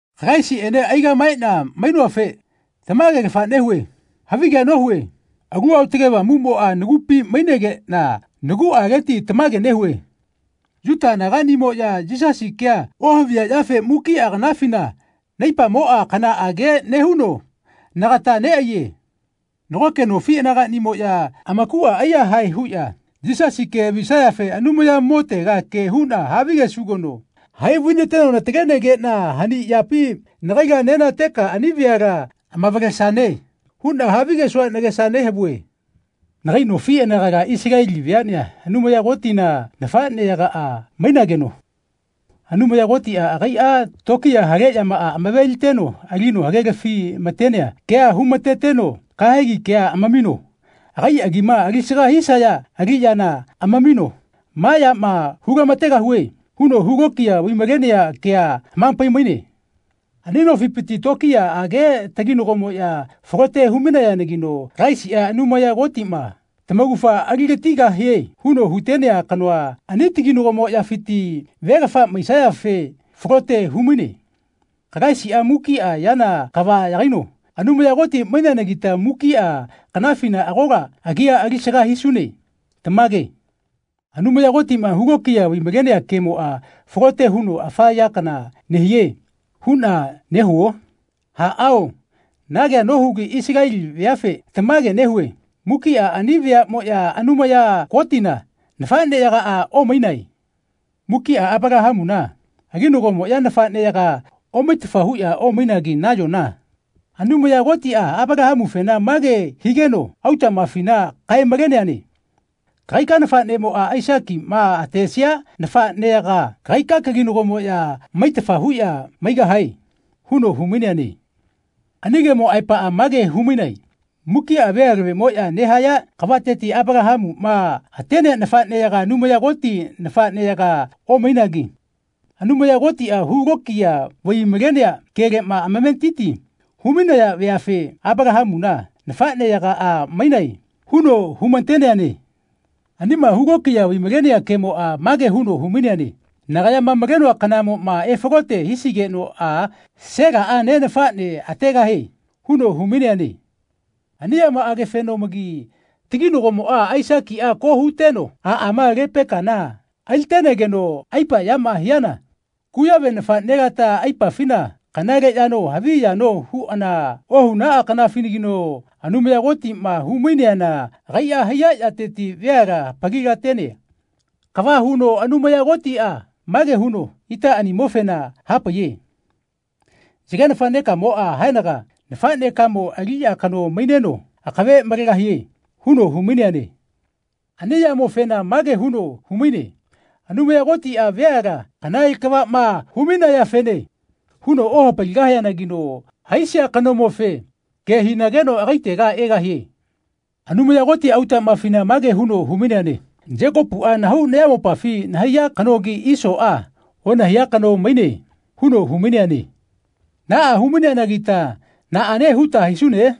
Kalaisiꞌene aigaꞌmaeꞌna mainoafe tamagelafa nehue. Havige nohue. Alu Aotage Avamuꞌmoꞌa nagupi mainegeꞌna naguꞌaleti tamage nehue. Yuta anagaꞌnimoꞌya Yisasi kea ohaviyaꞌyafe mukiꞌa kanafina naipamoꞌa kanaꞌage nehuno nagata neꞌaiye. Nagoke nofi anagaꞌnimoꞌya amakuꞌa aiyahae huꞌya Yisasi ke havisayafe Anumayamotega ke huꞌna havigesugeno “Hai vainateno natalenegeꞌna hani yapi nagaila nenateka ani veala amavalesane.” huꞌna havigesua nagesa nehavue. Nagai nofi anagala Isaleli veaꞌnea Anumaya Kotina nafaꞌneyagaꞌa mainageno Anumaya Kotiꞌa agaiꞌa tokiya hale yamaꞌa amaveliteno alino hagelafi-matenea kea humateteno kahegi kea amamino agai agima alisaga hisaya aliꞌyana amamino “Maꞌa yama hulamategahue.” huno hulokiya vaimalenea kea hamapai-maine. Ani nofipiti tokiyaꞌage taginagomoꞌya falote humainayanagino Kalaisiꞌa Anumaya Kotiꞌma tamaugafa aligatigahie huno hutenea kanoa ani taginagomoꞌyafiti velafa maisiafe falote humaine. Kalaisiꞌa mukiꞌa yana kava yagaino Anumaya Koti maineanagita mukiꞌa kanafina agola agia alisaga hisune. Tamage. Anumaya Kotiꞌma hulokiya vaimalenea kemoꞌa falote huno afa ya kana nehie huꞌna nehuo? Aꞌao na kea nohugi Isaleli veafe tamage nehue mukiꞌa ani veaꞌmoꞌya Anumaya Kotina nafaꞌneyagaꞌa omainae. Mukiꞌa Apalahamuna aginagomoꞌya nafaꞌneyagaꞌa omaitafa huꞌya omainagi nayona Anumaya Kotiꞌa Apalahamufena mage higeno autaꞌmafina kae-maleneane “Kagaika nafaꞌnemoꞌa Aisakiꞌma atesia nafaꞌneyaga kagai kaginagomoꞌya maitafa huꞌya maigahae.” huno humaineane. Ani kemo aepaꞌa mage humaine mukiꞌa vealavemoꞌya nehaya kavateti Apalahamuꞌma atenea nafaꞌneyaga Anumaya Koti nafaꞌneyaga omainagi Anumaya Kotiꞌa hulokiya vai-malenea keleꞌma amametiti humainaya veafe “Apalahamuna nafaꞌneyagaꞌa mainae.” huno humateneane. Anima hulokiya vaimalenea kemoꞌa mage huno humaine “Nagayama malenoa kanamoꞌma efalote hisigenoꞌa Selaꞌa ne nafaꞌne ategahie.” huno humaineane. Ani yamaꞌagefeno-magi taginagomoꞌa Aisakiꞌa ko huteno aꞌama Lepekana alitenegeno aipa yama hiana kuyave nafaꞌnelata aipafina kanale yano havi yano huꞌana ohunaꞌa kanafinagino Anumaya Kotiꞌma humaineana agaiꞌa haiya yateti veala hapalilatenea kava huno Anumaya Kotiꞌa mage huno itaꞌanimofena hapaiye “Yage nafaꞌnekamoꞌa haenaga nafaꞌnekamo aliꞌya kano maineno akave malegahie.” huno humaineane. Ani yamofena mage huno humaine Anumaya Kotiꞌa veala kanale kavaꞌma humainayafene huno ohapaligahianagino haisia kanomofe ke hinageno agaitega egahie. Anumaya Koti autaꞌmafina mage huno humaineane “Yekopuꞌa nahau nayamopafi nahaiya kanogi Isoꞌa onahaiya kano maine.” huno humaineane. Naꞌa hu-maineanagita naꞌane huta hisune?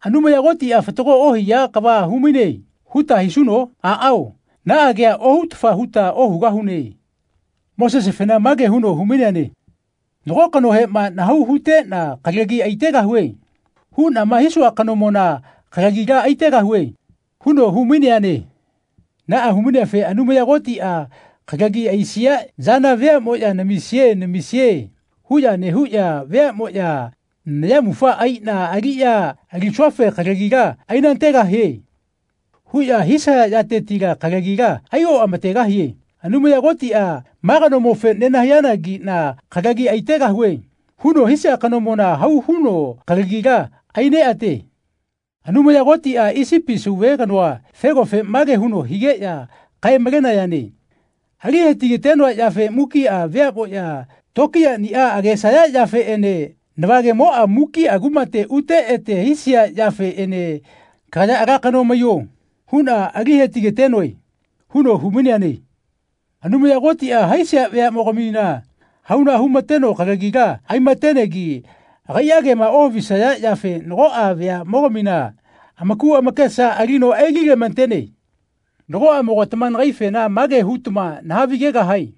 “Anumaya Kotiꞌa fatago ohia kava humaine.” huta hisuno? Aꞌao naꞌa kea ohutafa huta ohugahune. Mosesefena mage huno humaineane “Nago kanohema ‘Nahau huteꞌna kalagi aitegahue.’ huꞌnama hisua kanomona kalagila aitegahue.” huno humaineane. Naꞌa humaineafe Anumaya Kotiꞌa kalagi aisia yana veaꞌmoꞌya “Namisie namisie.” huꞌya nehuꞌya veaꞌmoꞌya “Nayamufa aiꞌna aliꞌya alisuafe kalagila ainategahie.” huꞌya hisaya yatetila kalagila aioꞌamategahie. Anumaya Kotiꞌa “Ma kanomofe nenahaiyanagiꞌna kalagi aitegahue.” huno hisia kanomona hau huno kalagila aineꞌate. Anumaya Kotiꞌa Isipi sauve kanoa Felofe mage huno higeꞌya kae-malenayane “Alihetigatenoa yafe mukiꞌa veaꞌmoꞌya tokiyaꞌniꞌa agesaya yafeꞌene navagemoꞌa mukiꞌa kumate ute ete hisia yafeꞌene ‘Kagaya ala kano maiyo.’ huꞌna ali hetigatenoe.” huno humaineane. Anumaya Kotiꞌa haisia veaꞌmogamina hauna humateno kalagila aimatenegi agaiꞌa kema ohavisaya yafe nagoꞌa veaꞌmogamina amaku amakesa alino aililematene. Nagoꞌamogatama nagaifena mage hutama nahavigegahae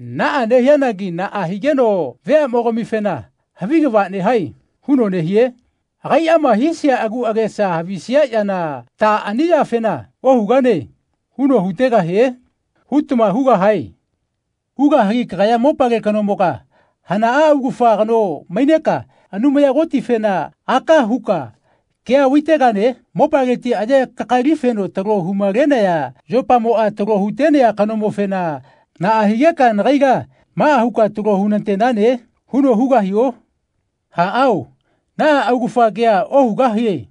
“Naꞌa nehianagi naꞌa higeno veaꞌmogamifena ‘Havi kava nehae.’ huno nehie? Agaiꞌama haisia agu agesa havisia yana ta ani yafena ‘Ohugane.’ huno hutegahie?” hutama hugahae. Hugahagi kagaya mopale kanomoga hanaꞌa augafa kano maineka Anumaya Kotifena aka huka kea vaitegane? Mopaleti aye kakalifeno talo humalenaya yopamoꞌa talo hutenea kanomofena “Naꞌa higeka nagaila maꞌa huka talo hunatenane?” huno hugahio? Aꞌao, naꞌa augafa kea ohugahie.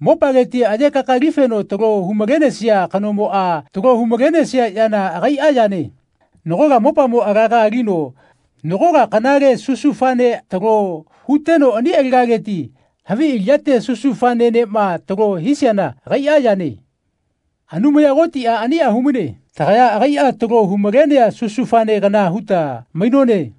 Mopaleti aye kakalifeno talo humalenesia kanomoꞌa talo humalenesia yana agaiꞌa yane. Nagola mopamo alaga alino nagola kanale susufanea talo huteno ani alagaleti havi aliꞌyate susufanenema talo hisiana agaiꞌa yane. Anumaya Kotiꞌa aniꞌa humaine. Tagaya agaiꞌa talo humalenea susufane kana huta mainone.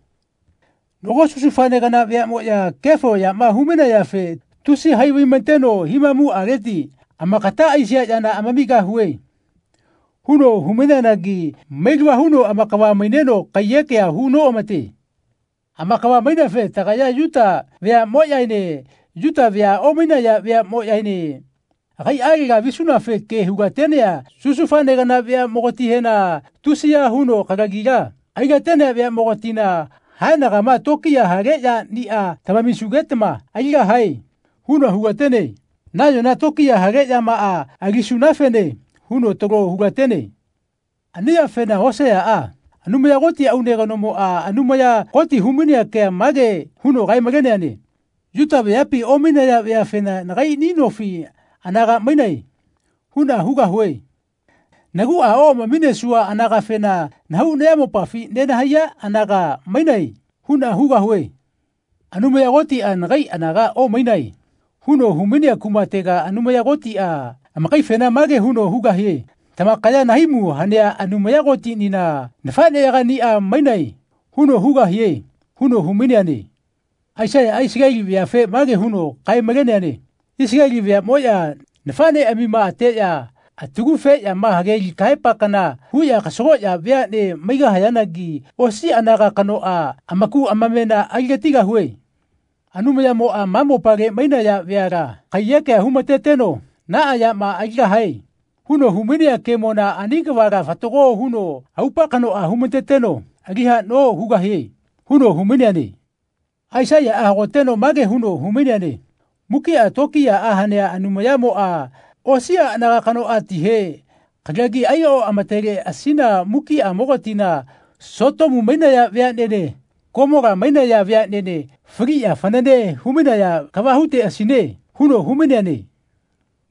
Nago susufane kana veaꞌmoꞌya kefo yama humainayafe tusi hai vaimateno himamuꞌaleti “Amakata aisia yana amamigahue.” huno humaineanagi mailava huno amakava-maineno kaiyekea hu noꞌamate. Amakava-maineafe tagaya Yuta veaꞌmoꞌyaene Yuta vea omainaya veaꞌmoꞌyaene agaiꞌalega visunafe ke hulatenea susufane kana veaꞌmogatihena, tusiya huno kalagila ailatenea veaꞌmogatina “Haenagama tokiya hale yaniꞌa tamamisugetama aligahae.” huno hulatene. Nayona tokiya hale yamaꞌa alisunafene huno talo hulatene. Ani yafena Hoseaꞌa, Anumaya Koti aune kanomoꞌa Anumaya Koti humainea kea mage huno kae-maleneane “Yuta veapi omainaya veafena ‘Nagaiꞌni nofi anaga mainae.’ huꞌna hugahue. Naguꞌa oꞌamaminesua anagafena ‘Nahau nayamopafi nenahaiya anaga mainae.’ huꞌna hugahue. Anumaya Kotiꞌa ‘Nagai anaga omainae.’ huno humainea kumatega Anumaya Kotiꞌa amakaifena mage huno hugahie ‘Tamakaya nahaimu hanea Anumaya Kotinina nafaꞌneyagaꞌniꞌa mainae.’ huno hugahie.” huno humaineane. Aisaiyaꞌa Isaleli veafe mage huno kae-maleneane “Isaleli veaꞌmoꞌya nafaꞌneꞌamima ateꞌya atagufeꞌyama hage li kahaepa kana huꞌya kasagoꞌya veaꞌne maigahayanagi osi anaga kanoꞌa amaku amamena aligatigahue. Anumayamoꞌa ma mopale mainaya veala kaiyekea humateteno ‘Naꞌa yama aligahae.’ huno humainea kemona ani kavala fatago huno aupa kanoꞌa humateteno ali haꞌno hugahie.” huno humaineane. Aisaiyaꞌa hagoteno mage huno humaineane “Mukiꞌa tokiyaꞌa hanea Anumayamoꞌa osiꞌa anaga kanoꞌatihe kalagi aioꞌamateleꞌasina mukiꞌamogatina Sotomu mainaya veaꞌnene Komola mainaya veaꞌnene faliꞌya fanane humainaya kava huteꞌasine.” huno humaineane.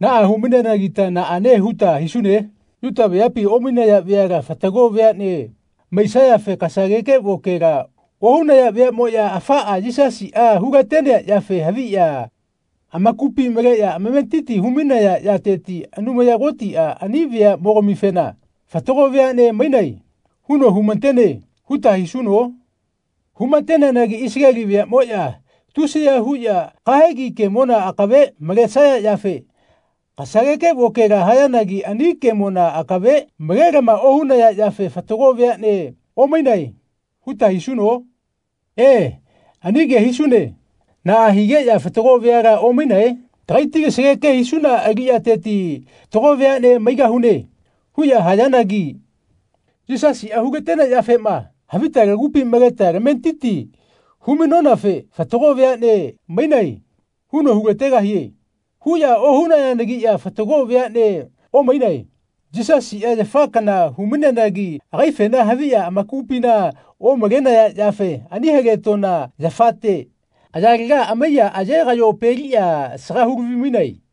Naꞌa hu-maineanagita naꞌane huta hisune? Yuta veapi omainaya veala fatago veaꞌne maisayafe kasageke vokela ohunaya veaꞌmoꞌya afaꞌa Yisasiꞌa hulatenea yafe haviꞌya amakupi maleꞌya amametiti humainaya yateti Anumaya Kotiꞌa ani veaꞌmogamifena “Fatago veaꞌne mainae.” huno humatene huta hisuno? Humateneanagi Isaleli veaꞌmoꞌya tusiya huꞌya kahegi kemona akave malesaya yafe kasageke vokela hayanagi ani kemona akave malelama ohunaya yafe fatago veaꞌnea omainae huta hisuno? E, ani ke hisune. Naꞌa higeꞌya fatago veala omainae? “Tagaiti kasageke hisuna aliꞌyateti fatago veaꞌne maigahune.” huꞌya hayanagi “Yisasiꞌa hulatenea yafema havita lagupi maleta tametiti humainonafe ‘Fatago veaꞌne mainae.’ huno hulategahie.” huꞌya ohunayanagiꞌya fatago veaꞌnea omainae. Yisasiꞌa yafa kana humaineanagi agaifena haviꞌya amakupina omalenaya yafe ani haletoꞌna yafate ayalega amaiya aye-kaꞌyopeliꞌya asaga hulavi-mainae.